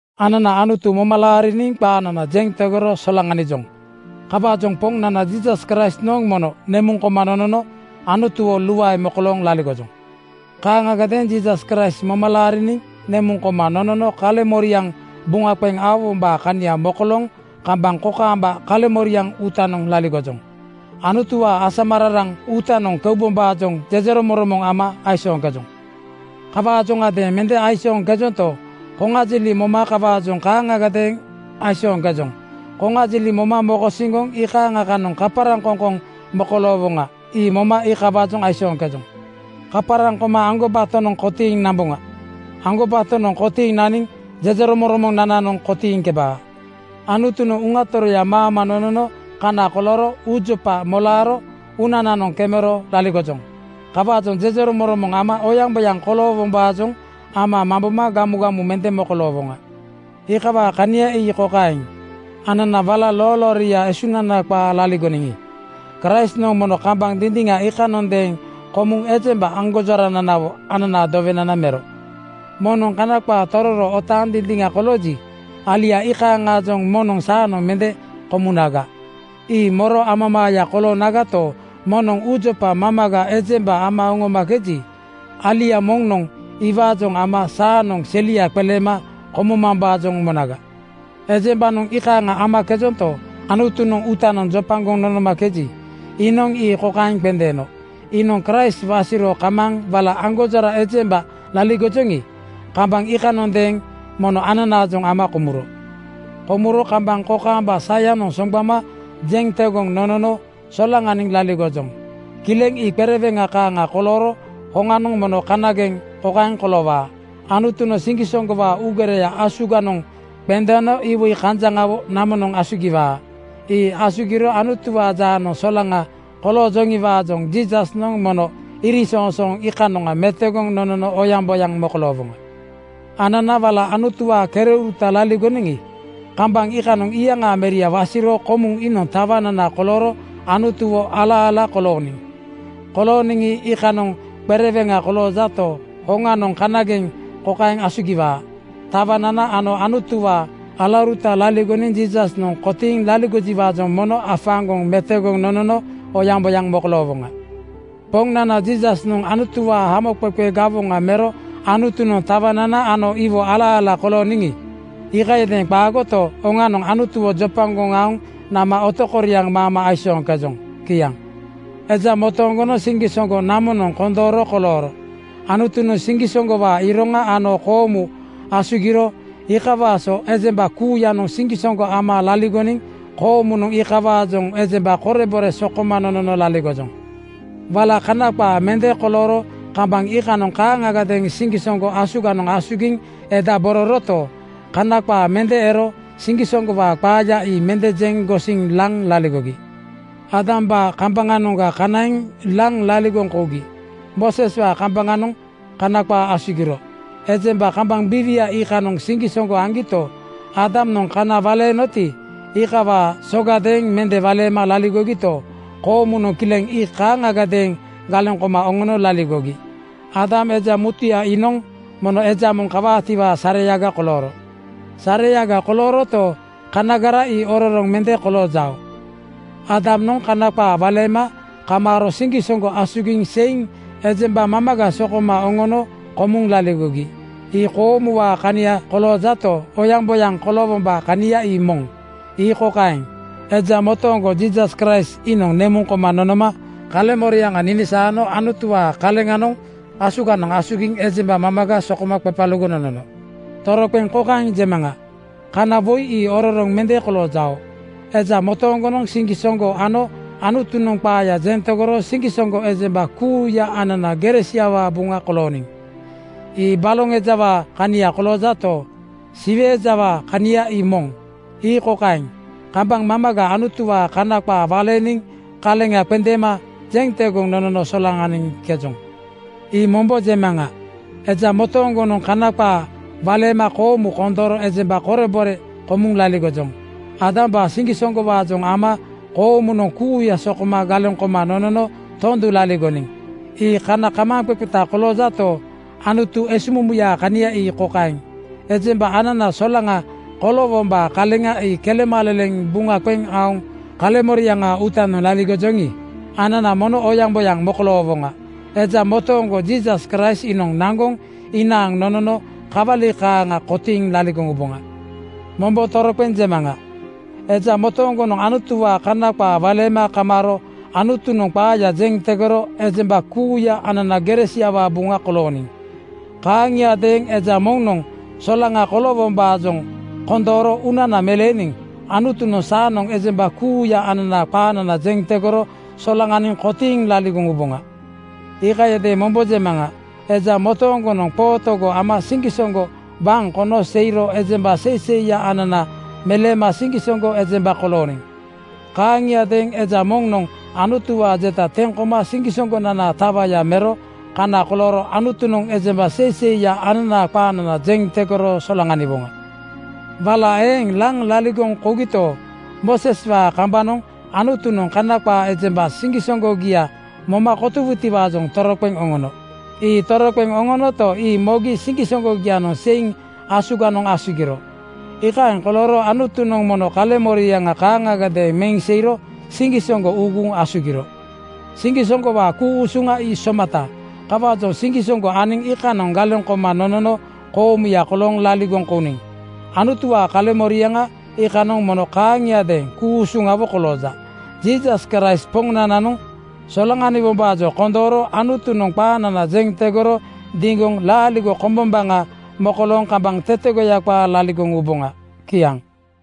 Anana Anutu moma laariniŋ qaanana jeŋ tegoro solaŋanijoŋ. Kawaajoŋ Poŋnana Jiisas Kraistnoŋ mono nemuŋ koma nonono Anutuwo luae mokolooŋ laligojoŋ. Kaaŋagadeeŋ Jiisas Kraist moma laariniŋ nemuŋ koma nonono kaleŋmoriaŋ buŋa qeŋ aowombaa kania mokolooŋ kambaŋ kokaamba kaleŋmoriaŋ uutanoŋ laligojoŋ. Anutuwaa asamararaŋ uutanoŋ keubombaajoŋ jejeromoŋromoŋ ama aisooŋkejoŋ. Kawaajoŋadeeŋ mende aisooŋkejonto, koŋajiliŋ moma kawaajoŋ kaaŋagadeeŋ aisooŋkejoŋ. Koŋajiliŋ moma mokosiŋgoŋ iikaaŋa kanoŋ kaparaŋkoŋkoŋ mokoloowoŋa. Ii moma iikawaajoŋ aisooŋkejoŋ. Kaparaŋ koma aŋgobatonoŋ kotiiŋ namboŋa. Aŋgobatonoŋ kotiiŋ naniŋ jejeromoŋromonananoŋ kotiiŋkebaa. Anutunoŋ Uŋa Toroya ama nonono kana kolooro uujopaa molaaro uunananoŋ kemero laligojoŋ. Kawaajoŋ jejeromoŋromoŋ ama oyaŋboyaŋ koloowombaajoŋ ama mamboma gamugamu mende mokoloowoŋa. Iikawaa kania ii kokaeŋ: Anana wala loolooria esunana qaa laligoniŋi, Kraistnoŋ mono kambaŋ dindiŋa iikanondeeŋ komuŋ ejemba aŋgonjorananawo ananaa dowenana mero. Moŋnoŋ Kana qaa tororo otaaŋ dindiŋa kolooji, alia iikaaŋaajoŋ moŋnoŋ saanoŋ mende komunaga? Ii moro amamaaya koloonagato, moŋnoŋ uujopa mamaga ejemba ama oŋomakeji, alia moŋnoŋ iwaajoŋ ama saanoŋ selia qeleema komumambaajoŋ monaga. Ejembanoŋ iikaaŋa amakejonto, Anutunoŋ uutanoŋ jopagoŋ nonomakeji, iinoŋ ii kokaeŋ qendeeno: Iinoŋ Kraist wasiro kamaaŋ wala aŋgonjora ejemba laligoniŋi, kambaŋ iikanondeeŋ mono ananaajoŋ ama komuro. Komuro kambaŋ kokaamba sayanoŋ soŋgbama jeŋ tegoŋ nonono solaŋaniŋ laligojoŋ. Kileŋ ii qereweŋa kaaŋa kolooro hoŋanoŋ mono kanageŋ kokaeŋ koloowaa: Anutunoŋ siŋgisoŋgowaa uugereya asuganoŋ qendeeno iwoi kanjaŋawo namonoŋ asugiwaa. Ii asugiro Anutuwaa jaanoŋ solaŋa koloojoŋiwaajoŋ Jiisasnoŋ mono iriŋsoŋsooŋ iikanoŋa metogoŋ nonono oyaŋboyaŋ mokoloowoŋa. Anana wala Anutuwaa kereuruta laligoniŋi, kambaŋ iikanoŋ iyaŋaa Meria wasiro komuŋ iinoŋ tawanana kolooro Anutuwo ala-ala kolooniŋ. Kolooniŋi, iikanoŋ qereweŋa koloojato, hoŋanoŋ kanageŋ kokaeŋ asugiwaa: Tawanana ano Anutuwaa alauruta laligoniŋ Jiisasnoŋ kotiiŋ laligojiwaajoŋ mono afaaŋgoŋ metogoŋ nonono oyaŋboyaŋ mokoloowoŋa. Poŋnana Jiisasnoŋ Anutuwaa hamoqeqe gawoŋa mero Anutunoŋ tawanana ano iwo ala-ala kolooniŋi, iikayadeeŋ qaagoto, oŋanoŋ Anutuwo jopagoŋ aoŋ nama otokoriaŋ maama aisooŋkejoŋ. Kiaŋ. Eja motooŋgonoŋ siŋgisoŋgo namonoŋ kondooro kolooro. Anutunoŋ siŋgisoŋgowaa iroŋa ano koomu asugiro. Iikawaa so ejemba kuuyanoŋ siŋgisoŋgo ama laligoniŋ koomunoŋ iikawaajoŋ ejemba korebore sokoma nonono laligojoŋ. Wala Kana qaa mende kolooro kambaŋ iikanoŋ kaaŋagadeeŋ siŋgisoŋgo asuganoŋ asugiŋ edabororoto, Kana qaa mende ero siŋgisoŋgowaa qaaya ii mende jeŋ gosiŋ laŋ laligogi. Aadambaa kambaŋanoŋga kanaiŋ laŋ laligoŋ kougi Mooseswaa kambaŋanoŋ Kana qaa asugiro. Ejemba kambaŋ biiwianoŋ iikanoŋ siŋgisoŋgo aŋgito, Aadamnoŋ kana waleenoti, iikawaa sogadeeŋ mende waleema laligogito, koomunoŋ kileŋ ii kaaŋagadeeŋ galeŋ koma oŋono laligogi. Aadam, eja mutuya iinoŋ mono eja moŋ kawaatiwaa sareyaga kolooro. Sareyaga kolooroto, kanagara ii ororoŋ mende koloojao. Aadamnoŋ Kana qaa waleema kamaaro siŋgisoŋgo asugiŋ seiŋ ejemba mamaga sokoma oŋono komuŋ laligogi. Ii koomuwaa kania koloojato, oyaŋboyaŋ koloowombaa kania ii moŋ. Ii kokaeŋ: Eja motooŋgo Jiisas Kraist iinoŋ nemuŋ koma nonoma kaleŋmoriaŋa ninisaano Anutuwaa kaleŋanoŋ asuganoŋ asugiŋ ejemba mamaga sokoma qepalugoŋ nonono. Toroqeŋ kokaeŋ jemaŋa: Kana woi ii ororoŋ mende koloojao. Eja motooŋgonoŋ siŋgisoŋgo ano Anutunoŋ qaaya jeŋ tegoro siŋgisoŋgo ejemba kuuya anana gere siawaa buŋa kolooniŋ. Ii baloŋ ejawaa kania koloojato, Siwe ejawaa kania ii moŋ. Ii kokaeŋ: Kambaŋ mamaga Anutuwaa Kana qaa waleeniŋ kaleŋa qendeema jeŋ tegoŋ nonono solaŋaniŋkejoŋ. Ii mombo jemaŋa: Eja motooŋgonoŋ Kana qaa waleema koomu kondooro ejemba korebore komuŋ laligojoŋ. Aadambaa siŋgisoŋgowaajoŋ ama koomunoŋ kuuya sokoma galeŋ koma nonono tondu laligoniŋ. Ii kana kamaaŋqeqeta koloojato, Anutu esuŋmumuyaa kania ii kokaeŋ: Ejemba anana solaŋa koloowombaa kaleŋa ii kelemaleleŋ buŋa qeŋ aoŋ kaleŋmoriaŋaa uutanoŋ laligojoŋi, anana mono oyaŋboyaŋ mokoloowoŋa. Eja motooŋgo Jiisas Kraist iinoŋ naŋgoŋ inaaŋ nonono kawali kaaŋa kotiiŋ laligoŋ uboŋa. Mombo toroqeŋ jemaŋa: Eja motooŋgonoŋ Anutuwaa Kana qaa waleema kamaaro Anutunoŋ qaaya jeŋ tegoro ejemba kuuya anana gere siawaa buŋa kolooniŋ. Kaaŋiadeeŋ eja moŋnoŋ solaŋa koloowombaajoŋ kondooro uunana meleeniŋ Anutunoŋ saanoŋ ejemba kuuya ananaa qaanana jeŋ tegoro solaŋaniŋ kotiiŋ laligoŋ uboŋa. Iikayadeeŋ mombo jemaŋa: Eja motooŋgonoŋ qootogo ama siŋgisoŋgo waŋ kono seiro ejemba seiseiya anana meleema siŋgisoŋgo ejemba kolooniŋ. Kaaŋiadeeŋ eja moŋnoŋ Anutuwaa jeta teŋ koma siŋgisoŋgonanaa tawaya mero kana kolooro Anutunoŋ ejemba seiseiya ananaa qaanana jeŋ tegoro solaŋaniwoŋa. Wala eeŋ laŋ laligoŋ kougito, Mooseswaa kambanoŋ Anutunoŋ Kana qaa ejemba siŋgisoŋgogia moma kotowutiwaajoŋ toroqeŋ oŋono. Ii toroqeŋ oŋonoto, ii mogi siŋgisoŋgogianoŋ seiŋ asuganoŋ asugiro. Iikaeŋ kolooro Anutunoŋ mono kaleŋmoriaŋa kaaŋagadeeŋ meŋ seiro siŋgisoŋgo uuguŋ asugiro. Siŋgisoŋgowaa ku-usuŋa ii somata. Kawaajoŋ siŋgisoŋgo aniŋ iikanoŋ galeŋ koma nonono koomuya kolooŋ laligoŋ kouniŋ. Anutuwaa kaleŋmoriaŋa iikanoŋ mono kaaŋiadeeŋ ku-usuŋawo kolooja. Jiisas Kraist Poŋnananoŋ solaŋaniwombaajoŋ kondooro Anutunoŋ qaanana jeŋ tegoro diŋgoŋ laaligo kombombaŋa mokolooŋ kambaŋ tetegoya qaa laligoŋ uboŋa. Kiaŋ.